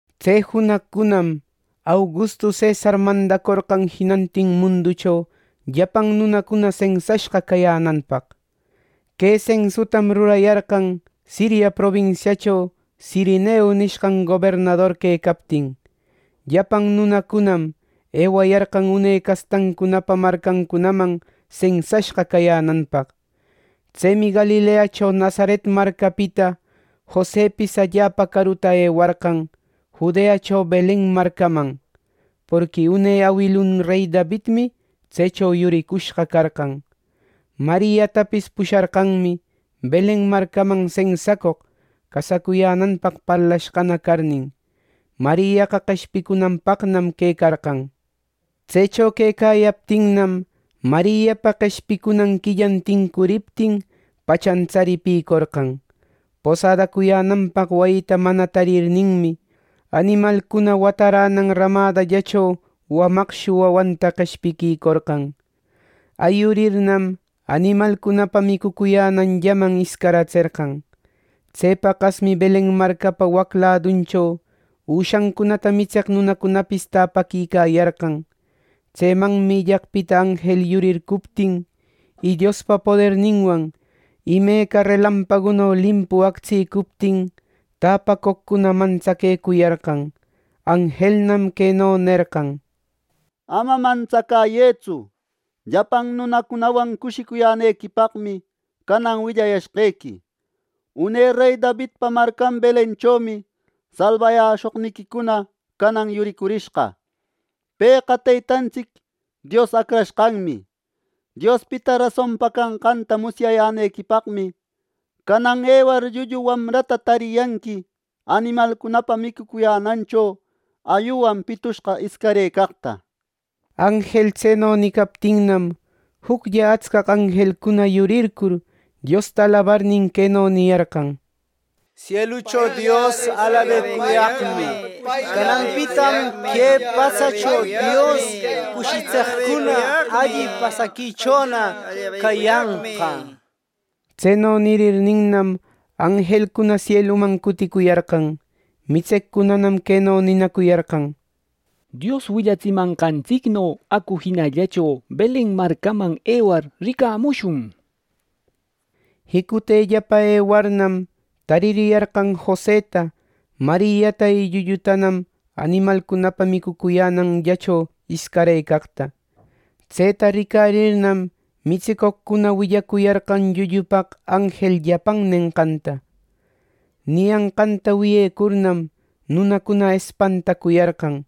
Tse junaqcunam, Augustu cesar mandacorqan jinantin munducho llapan nunacuna sensashqa cayänanpaq. Que sensutam rurayarqan Siria probinsiacho Sirenio nishqan gobernador quecaptin. Llapan nunacunam ewayarqan une castancunapa marcancunaman sensashqa cayänanpaq. Tsemi Galileacho Nazaret marcapita Josepis allapa caruta ewarqan, Judeacho Belen marcaman. Porqui une awilun rey Davidmi tsecho yuricushqa carqan. Mariatapis pusharqanmi Belen marcaman sensacoq, casacuyänanpaq parlashqana carnin. Mariaqa qeshpicunanpaqnam quecarqan. Tsecho quecayaptinnam, Mariapa qeshpicunan quilla tincuriptin, pachan tsaripïcorqan. Posadacuyänanpaq wayita mana tarirninmi, animalcuna wataränan rämadallacho wamaqshu wawanta qeshpiquïcorqan. Ayurirnam, animalcunapa micucuyänanllaman iscaratserqan. Tse paqasmi Belen marcapa wac laduncho üshancunata mitseq nunacunapis täpaquicayarqan. Tsemanmi illaqpita anjel yurircuptin, y Diospa poderninwan imeca relampaguno limpu actsïcuptin, täpacoqcuna mantsaquecuyarqan. Anjelnam queno nerqan: —Ama mantsacäyëtsu. Llapan nunacunawan cushicuyänequipaqmi, canan willayashqequi: Une rey Davidpa marcan Belenchomi salbayäshoqniquicuna canan yuricurishqa. ¡Pëqa Teytantsic Dios Acrashqanmi! Diospita rasonpa canqanta musyayänequipaqmi, canan ewar, llullu wamrata tariyanqui animalcunapa micucuyänancho ayuwan pitushqa iscarëcaqta. Anjel tseno nicaptinnam, juclla atscaq anjelcuna yurircur, Diosta alabarnin, queno niyarqan: —¡Sielucho Dios, alabecuyaqmi! ¡Cananpitam que patsacho Dios cushitseqcuna alli pasaquichona cayanqa! —nir. Tseno nirirninnam, anjelcuna sieluman cuticuyarqan. Mitseqcunanam queno ninacuyarqan: —¡Dios willatsimanqantsicno acu jinallacho Belen marcaman ewar, ricamushun! Jicutellapa ewarnam, taririyarqan Joseta, Mariata y llullutanam animalcunapa micucuyänanllacho iscarëcaqta. Tseta ricarirnam mitsicoqcuna willacuyarqan llullupaq anjel llapan nenqanta. Niyanqanta wiyecurnam, nunacuna espantacuyarqan.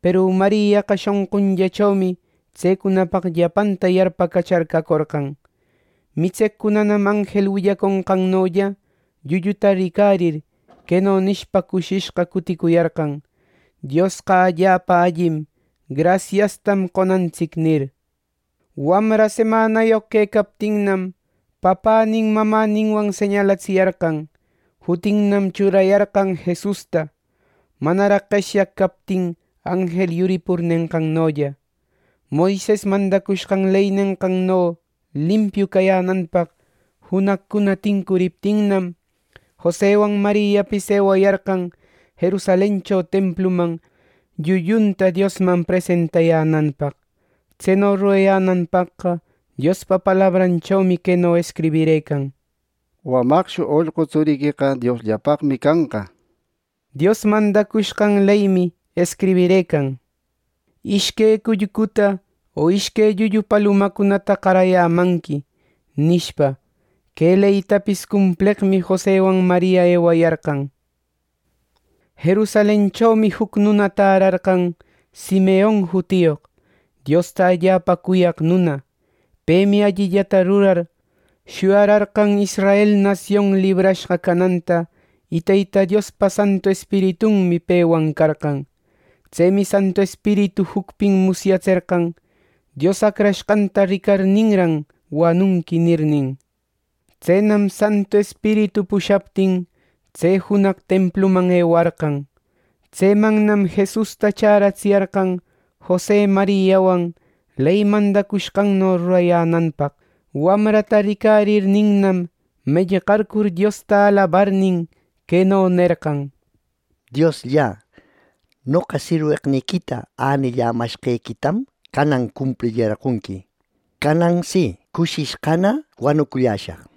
Peru Mariaqa shonqunllachomi tsecunapaq llapanta yarpacachar cacorqan. Mitseqcunanam anjel willaconqannolla llulluta ricarir, queno nishpa cushishqa cuticuyarqan: “¡Diosqa allapa allim! ¡Grasiastam qonantsic!” nir. Wamra semanayoq quecaptinnam, papänin mamäninwan señalatsiyarqan. Jutinnam churayarqan Jesusta, manaraq qeshyaq captin anjel yuripur nenqannolla. Moises mandacushqan ley nenqanno limpiu cayänanpaq junaqcuna tincuriptinnam, Josewan Mariapis ewayarqan Jerusalencho templuman llullunta Diosman presentayänanpaq. Tseno rurayänanpaqqa Diospa palabranmi queno escribirëcan: “Wamaqshu ollqu tsuriqueqa Diosllapaqmi canqa” nir. Dios mandacushqan leymi escribirëcan: “Ishque cullcuta o ishque llullu palumacunata qarayämanqui” nishpa. Que leytapis cumpleqmi Jose Mariawan ewayarqan. Jerusalenchomi juc nuna tärarqan, Simeon jutiyoq, Diosta allapa cuyaq nuna. Pemi allillata rurar, shuyararqan Israel nasion librashqa cananta, y Teyta Diospa Santu Espiritunmi pewan carqan. Tsemi Santu Espiritu jucpin musyatserqan: “Dios Acrashqanta ricarirninran, wanunqui” nirnin. Tsenam Santu Espiritu pushaptin, tse junaq templuman ewarqan. Tsemannam Jesusta chäratsiyarqan Jose Mariawan ley mandacushqanno rurayänanpaq. Wamrata ricarirninnam, mellqarcur Diosta alabarnin, queno nerqan: “Diosllä, noqa sirweqniquita änillämashqequitam canan cumplirillarqonqui. Canan si, cushishqana wanuculläshaq.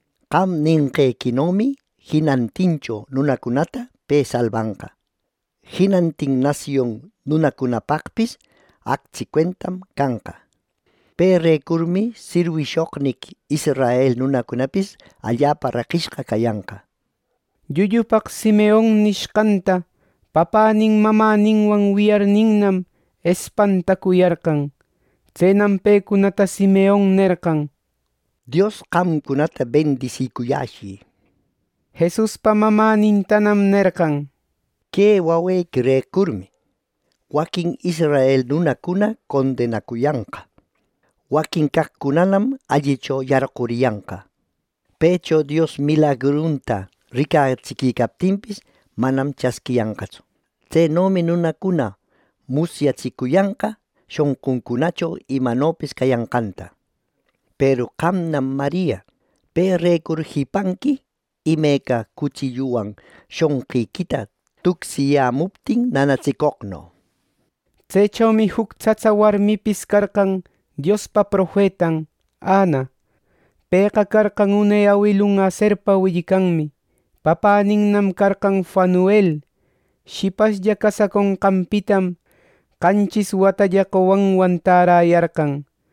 Qam nenqequinomi jinantincho nunacunata pe salbanqa. Jinantin nasion nunacunapaqpis actsi cuentam canqa. Perecurmi, sirwishoqniqui israel nunacunapis allapa reqishqa cayanqa.” Llullupaq Simeon nishqanta papänin mamäninwan wiyarninnam, espantacuyarqan. Tsenam pecunata Simeon nerqan: —Dios qamcunata bendisicuyäshi. Jesuspa mamänintanam nerqan: —Que wawequirecurmi, waquin israel nunacuna condenacuyanqa; waquin caqcunanam allicho yarquriyanqa. Pëcho Dios milagrunta ricatsiquicaptinpis, manam chasquiyanqatsu. Tsenomi nunacuna musyatsicuyanqa shonquncunacho imanopis cayanqanta. Peru qamnam Maria, perecur jipanqui imeca cutsilluwan shonqiquita tucsicayämuptin nanatsicoqno. Tsechomi juc tsatsa warmipis carqan Diospa profetan, Ana. Pëqa carqan une awilun Aserpa willcanmi. Papäninnam carqan Fanuel. Shipashlla casaconqanpitam qanchis watalla qowanwan täräyarqan.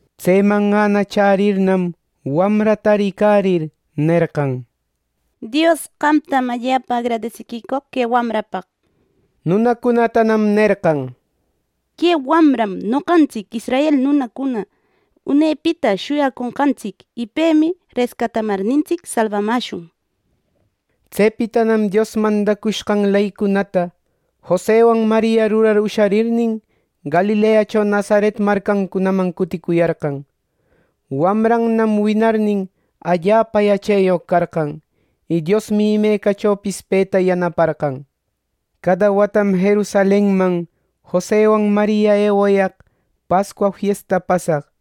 Tseman Ana chärirnam, wamrata ricarir, nerqan: —Dios, qamtam allapa agradisicoq que wamrapaq —nir. Nunacunatanam nerqan: —Que wamram noqantsic israel nunacuna unepita shuyaconqantsic, y pemi rescatamarnintsic salbamäshun —nir. Tsepitanam Dios mandacushqan leycunata Jose Mariawan rurar usharirnin, Galileacho Nazaret marcancunaman cuticuyarqan. Wamranam winarnin, allapa yacheyoq carqan, y Diosmi imecachopis peta yanaparqan. Cada watam Jerusalenman Jose Mariawan ewayaq Pascua fiesta pasaq.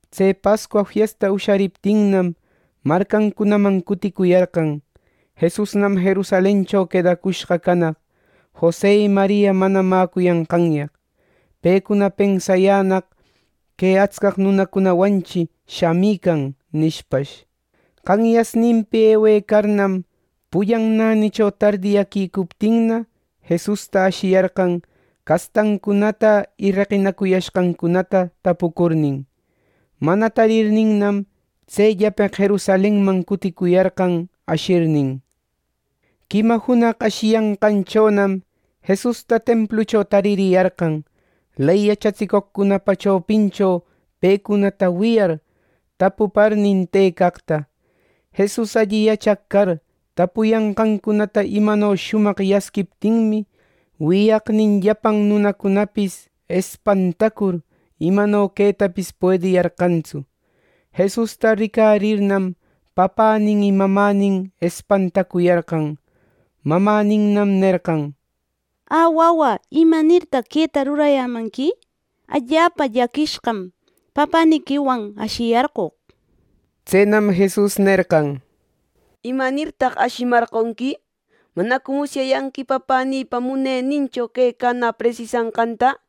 Tse Pascua fiesta ushariptinnam, marcancunaman cuticuyarqan. Jesusnam Jerusalencho quedacushqa canaq, Jose y Maria mana mäcuyanqanyaq. Pecuna pensayänaq: “Que atscaq nunacunawanchi shamican” nishpash. Qanyasninpi ewecarnam, pullan nänicho tardiyäquicuptinna, Jesusta ashiyarqan, castancunata y reqinacuyashqancunata tapucurnin. Mana tarirninnam, tsellapeq Jerusalenman cuticuyarqan ashirnin. Quima junaq ashiyanqanchonam, Jesusta templucho taririyarqan, ley yachatsicoqcunapa chopincho pecunata wiyar, tapuparnin tëcaqta. Jesus alli yachaq car, tapuyanqancunata imano shumaq yasquiptinmi, wiyaqnin llapan nunacunapis espantacur, imano quetapis puediyarqantsu. Jesusta ricarirnam, papänin y mamänin espantacuyarqan. Mamäninnam nerqan: —Ä, wawä, ¿imanirtaq queta rurayamanqui? Allapa llaquishqam papäniquiwan ashiyarqoq. Tsenam Jesus nerqan: —¿Imanirtaq ashiyämarqonqui? ¿Manacu musyayanqui Papänïpa munenincho quecanä presisanqanta?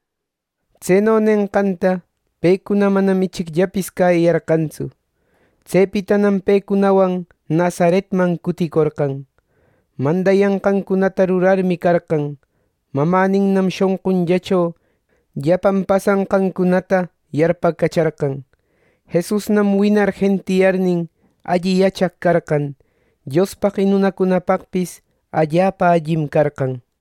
Tseno nenqanta pecuna manam ichicllapis cäyiyarqantsu. Tsepitanam pecunawan Nazaretman cuticorqan, mandayanqancunata rurarmi carqan. Mamäninnam shonqunllacho llapan pasanqancunata yarpacacharqan. Jesusnam winar jentiyarnin, alli yachaq carqan. Diospaq y nunacunapaqpis allapa allim carqan.